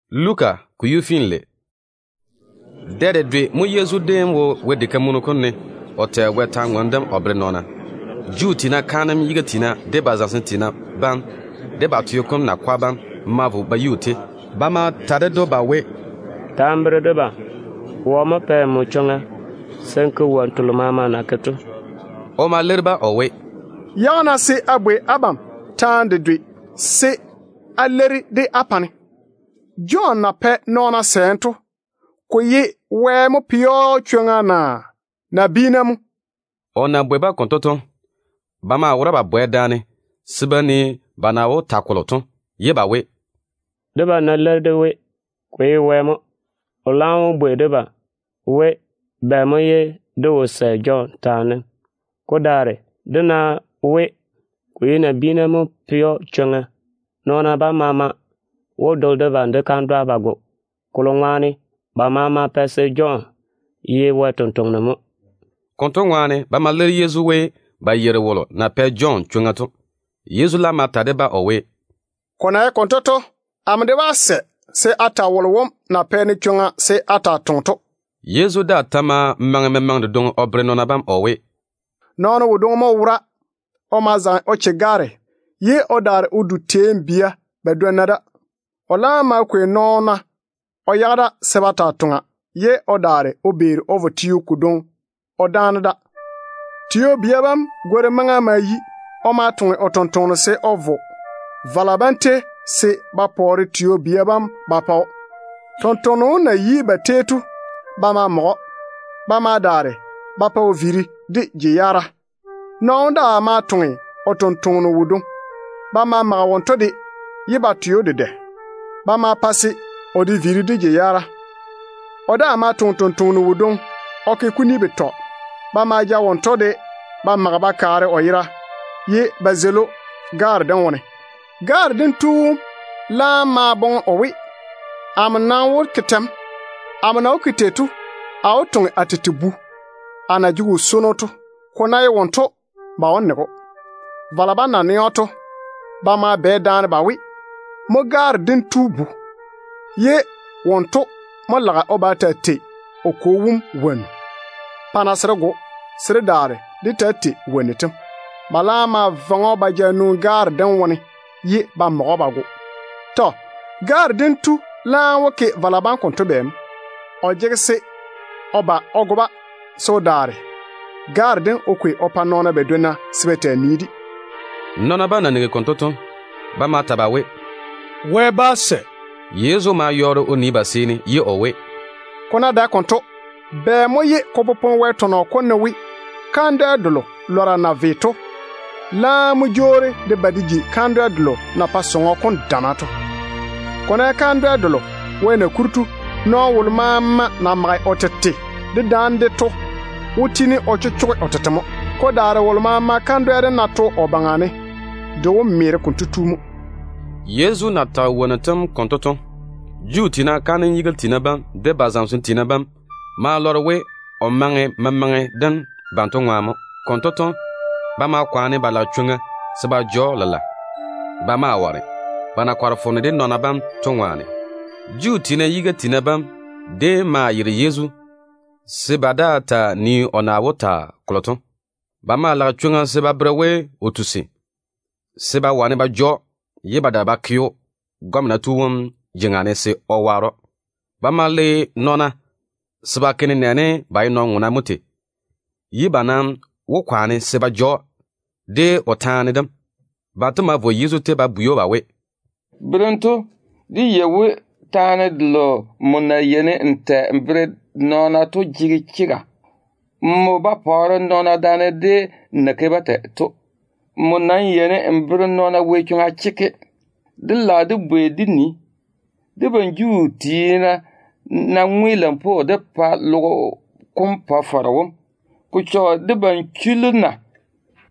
Yezu dam dem nwoŋi yei ne mo? Dɛ dedwe mo Yezu déem wo Wɛ diga kam konkɔlɔ kom ne o tɛ Wɛ kwor-ywoŋa kam o bere nɔɔna. Juu tiina kaanem yiga tiina, de ba zamesem tiina bam, de ba teo kom nakwa bam ma vo ba yi o tei. Ba ma ta ded‑o ba we, “Ta n bere debam, wɔ mo pɛ nmo chwoŋa se n ke wonnu telo maama n na ke to?” O ma leiri-ba o we, “Yage-na se a bwei abam taane dedwe se á leiri-de á pa-ne. Jɔn na pɛ nɔɔna sɛɛm to, ko ye Wɛ mo pɛ‑o chwoŋa naa nabiina mo?” O na bwei-ba konto to, ba maa wora ba bane daane se ba nii ba na wó ta kolo to, ye ba we, “Debam ná leiri dé we, ko ye Wɛ mo, o laam wó bwei debam we, bɛ mo ye dé wo sɛ Jɔn taane dem? Ko daare, dé ná we, ko ye nabiina mo pɛ‑o chwoŋa, nɔɔna bam maama wó dole debam de kandwa ba go, kolo ŋwaane ba maama pae se Jɔn ye Wɛ sampwora mo.” Konto ŋwaane ba ma leiri Yezu we ba yeiri wolo na pɛ Jɔn chwoŋa to. Yezu laam ma ta de-ba o we, “Ko na ye konto to, amo de nam bá ta wolo na pɛ-ne chwoŋa se a taa toŋe to.” Yezu daa ta ma maŋe memaŋe dedwoŋi o bere nɔɔna bam o we, “Nɔɔno wodwoŋi mo wora. O ma zaŋe o che gaare, ye o daare o jeiri Vini teeni de wone. O laam ma kwei nɔɔna o yage da se ba taa vara, ye o daare o vo teo kodwoŋi o dáane da. Tio-bia bam gworim maŋa ma yi. O ma toŋe o tontoŋeno se o vo vala bam tei se ba pɔɔre tio-bia bam ba pa‑o. Tontoŋeno wom na yi ba tei to, ba ma mage‑o. Ba ma daare ba pa o viiri de je-yaara. Nɔɔno wom daa ma toŋe o tontoŋeno wodwoŋi. Ba ma mage wonto de, ye ba twe‑o dedɛ. Ba ma pa se o de viiri de je-yaara. O daa ma toŋe tontoŋeno wodwoŋi o ke kuni betɔ. Ba ma ja wonto de ba mage ba kaare o yera, ye ba zeili‑o gaare dem wone. Gaare dem tu wom laam ma boŋe o we, ‘Amo nam wó ke tɛ mo? Amo na wó ke tei to, a wó toŋe a tete bu, a na jege o swono to. Ko ná ye wonto, ba wó nege‑o.’ Vala bam nam na nɛ‑o to, ba ma bane daane ba we, ‘Mo gaare dem tu bu-kwea kam, ye wonto mo lage o ba o taa tei o kwo wom wonnu. Pa-na se dé go‑o, se dé daare dé taa tei o wonnu tem.’ Ba laam ma vaŋe‑o ba ja nwoŋi gaare dem wone, ye ba mage‑o ba go. Tɔ. Gaare dem tu laam wó ke vala bam konto bɛ mo? O jege se o ba o go-ba, se o daare gaare dem o kwei o pa nɔɔna badwonna se ba taa nii-de.” Nɔɔna bam na nigi konto to, ba ma ta ba we, “Wɛ bá sɛ.” Yezu ma yɔɔre o nii ba seeni ye o we, “Ko ná dae konto, bɛ mo ye ko popone Wɛ tɔnɔ kom ne we: ‘Kandwɛ delo lɔra bam na ve to laam mo jwoori de ba de ji kandwɛ delo na pae diga kam dana to’? Ko ná ye kandwɛ delo Wɛ na kuri to, nɔɔno wolo maama na mage o tete dedaane-de to wó tiini o chochoge o tete mo. Ko daare wolo maama kandwɛ dem ná to o baŋa ne, de wó meere konto tu mo.” Yezu na tage wonnu tem konto to, Juu tiina kaanem yiga tiina bam de ba zamesem tiina bam ma lɔre we o maŋe memaŋe dem banto ŋwaane mo. Konto to, ba ma kwaane ba lage chwoŋa se ba ja‑o lela. Ba ma ware, ba na kɔre foone de nɔɔna bam to ŋwaane. Juu tiina yiga tiina bam déem ma yere Yezu se ba daa ta nii o na wó ta kolo to. Ba maa lage chwoŋa se ba bere we o tusi, se ba wane ba ja‑o ye ba daare ba ke‑o gɔmena tu wom jeŋa ne se o waare‑o. Ba ma le nɔɔna se ba ke nenɛɛne ba ye nɔn-ŋona mo tei, ye ba kwaane se ba ja‑o de o taane dem. Banto ma vo Yezu tei ba bwei‑o ba we, “Berem tu, dé yei we taane delo nmo na yeini n tɛ n bere nɔɔna to jege chega. Nmo ba pɔɔre nɔɔna daane de n na ke-ba tei to. Nmo nam yeini n bere nɔɔna Wɛ chwoŋa chekke. Dé lage dé bwei dé nii, debam Juu tiina ná ŋwe lampwoo dé pa logo kom Pa-faro wom, ko chɔge debam chullu na?”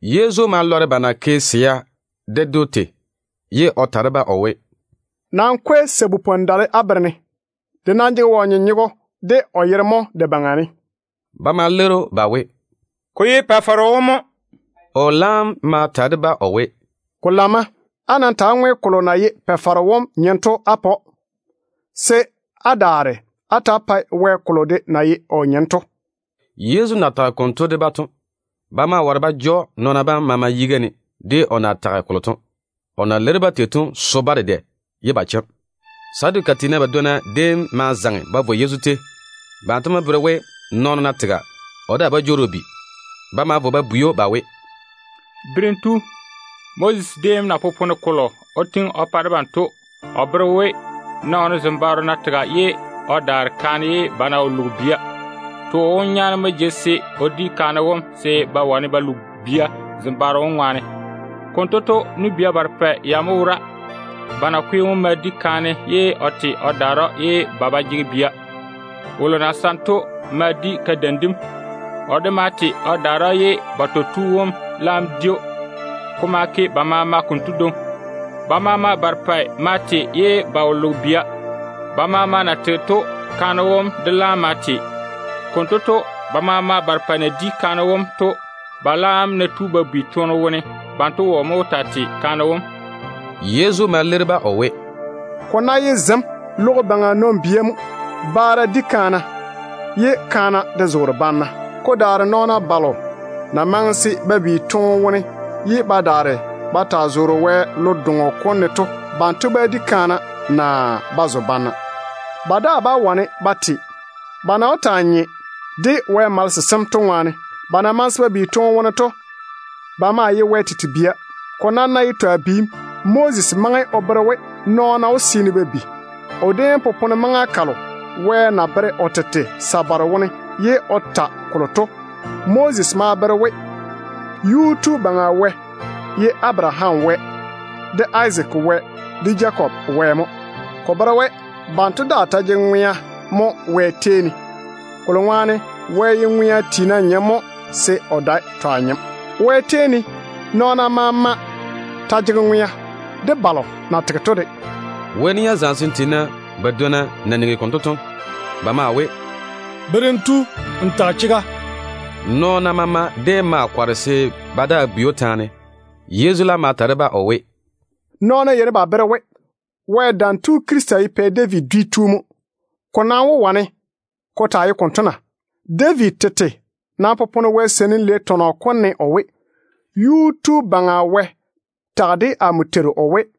Yezu ma lɔre ba na ke swa yalo to, ye o ta de-ba o we, “Nam kwei sabu-dale á bere-ne. De nam jege wɔ nyenyego de o yere mo de baŋa ne?” Ba ma leiri‑o ba we, “Ko ye Pa-faro wom mo.” O laam ma ta de-ba o we, “Ko lamma. Á nam ta‑á ŋwe kolo na ye Pa-faro wom nyem to á pa‑o, se á daare á ta‑á pae Wɛ kolo de na ye o nyem to.” Yezu na tage konto de-ba to, ba ma ware ba ja‑o nɔɔna bam maama yiga ne. O na leiri-ba tei to so-ba dedɛ ye ba chem. Saduka tiina badwonna déem ma zaŋe ba vo Yezu tei. Banto mo bere we, nɔɔno ná tega, o daa bá jwoori o bi. Ba ma vo ba bwei‑o ba we, “Berem tu, Moses déem na popone kolo o tiŋi o pa debam to, o bere we, nɔɔno zembaaro ná tega ye o daare kaane, ye ba ná wo loge bia, too wom nyaane mo jege se o di kaane wom se ba wane ba lo bia zembaaro wom ŋwaane. Konto to, nu-bia barepɛ ya mo wora. Ba nakwe wom ma di kaane ye o te o daare‑o ye ba ba jege bia. Wolo na saŋe to ma di kadeim dem. O de ma te o daare‑o, ye batɔ tu wom laam di‑o. Ko ma ke ba maama konto dwoŋi. Ba maama barepɛ ma te, ye ba wo loge bia. Ba maama na tege to, kaane wom de laam ma te. Konto to, ba maama barepɛ na di kaane wom to, ba laam ná tu ba bi toone wone, banto wɔ mo wó taa tei kaane wom?” Yezu ma leiri-ba o we, “Ko ná ye zem logo baŋa nɔn-bia mo, baara yeini ba di kaana, ye kaana de zoore banna. Ko daare nɔɔna balo na maŋe se ba bi toone wone ye ba daare ba taa ŋwe maŋa kam konto ne to, banto bá di kaana naa ba zo banna. Ba daa bá wane ba te, ba na wó taa nye de Wɛ malese sem to ŋwaane. Ba na maŋe se ba bi toone wone to, ba maa ye Wɛ tete bia. Ko nam ná ye twa biim, Moses maŋe o bere we nɔɔna wó seene ba bi. O déem tole maŋa kalo Wɛ na veere o tete sabare wone ye o ta kolo to taane. Moses ma bere we Yuu-tu Baŋa Wɛ ye Abaraham Wɛ, de Izaak Wɛ, de Jakob Wɛ mo. Ko bere we banto daa ta jege ŋwea mo Wɛ tei ne, kolo ŋwaane Wɛ ye ŋwea tiina nyem mo se o dae twa nyem. Wɛ tei ne, nɔɔna maama ta jege ŋwea, de balo na tege to de.” Wɛ nia zamesem tiina badwonna na nigi konto to, ba maa we, “Berem tu, n tage chega.” Nɔɔna maama déem ma kɔre se ba daa bwei‑o taane. Yezu laam ma ta de-ba o we, “Nɔɔna yeini ba bere we, Wɛ Dam Tu Krista wom ye Pɛ David dwi tu mo. Ko nam wó wane ko taa ye konto na? David tete nam popone Wɛ Seinim Lei tɔnɔ kom ne o we: ‘Yuu-tu Baŋa Wɛ tage de amo Teiru wom o we: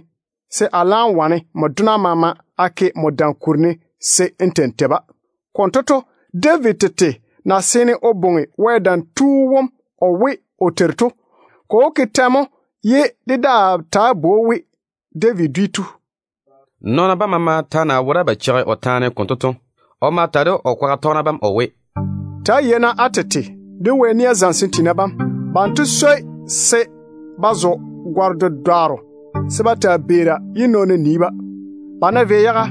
se a laam wane nmo dona bam maama a ke nmo dam kuri ne se n ta‑n tei-ba.’ Konto to, David tete na seene o bwoŋi Wɛ Dam tu wom o we o Teiru wom to, ko wó ke tɛ mo ye dé daa taa bwoi‑o we David dwi tu?” Nɔɔna bam maama ta na wora ba cheigi o taane konto to, o ma ta de o kwaga tɔgena bam o we, “Ta‑á yei-na á tete de Wɛ nia zamesem tiina bam. Banto swoi se ba zo gare-dedwaaro se ba taa beera ye nɔɔna nii-ba. Ba ná vei yaga,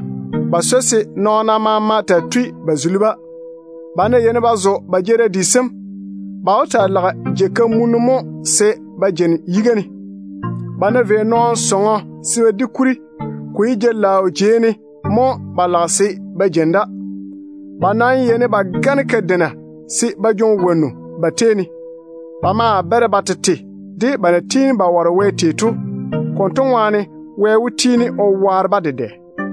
ba swoi se nɔɔna maama taa tui ba seini-ba. Ba ná yeini ba zo ba jeerim di sem, ba wó taa lage jei-kamunnu mo se ba jeini yiga ne. Ba ná vei nɔɔno sɔŋɔ se ba di kuri, ko ye jei-laao jei ne mo ba lage se ba jeini da. Ba nam yeini ba gane kadeina se ba jwoŋi wonnu ba tei ne. Ba maa bere ba tete de ba na tiini ba ware Wɛ tei to. Konto ŋwaane Wɛ wó tiini o waare-ba dedɛ.”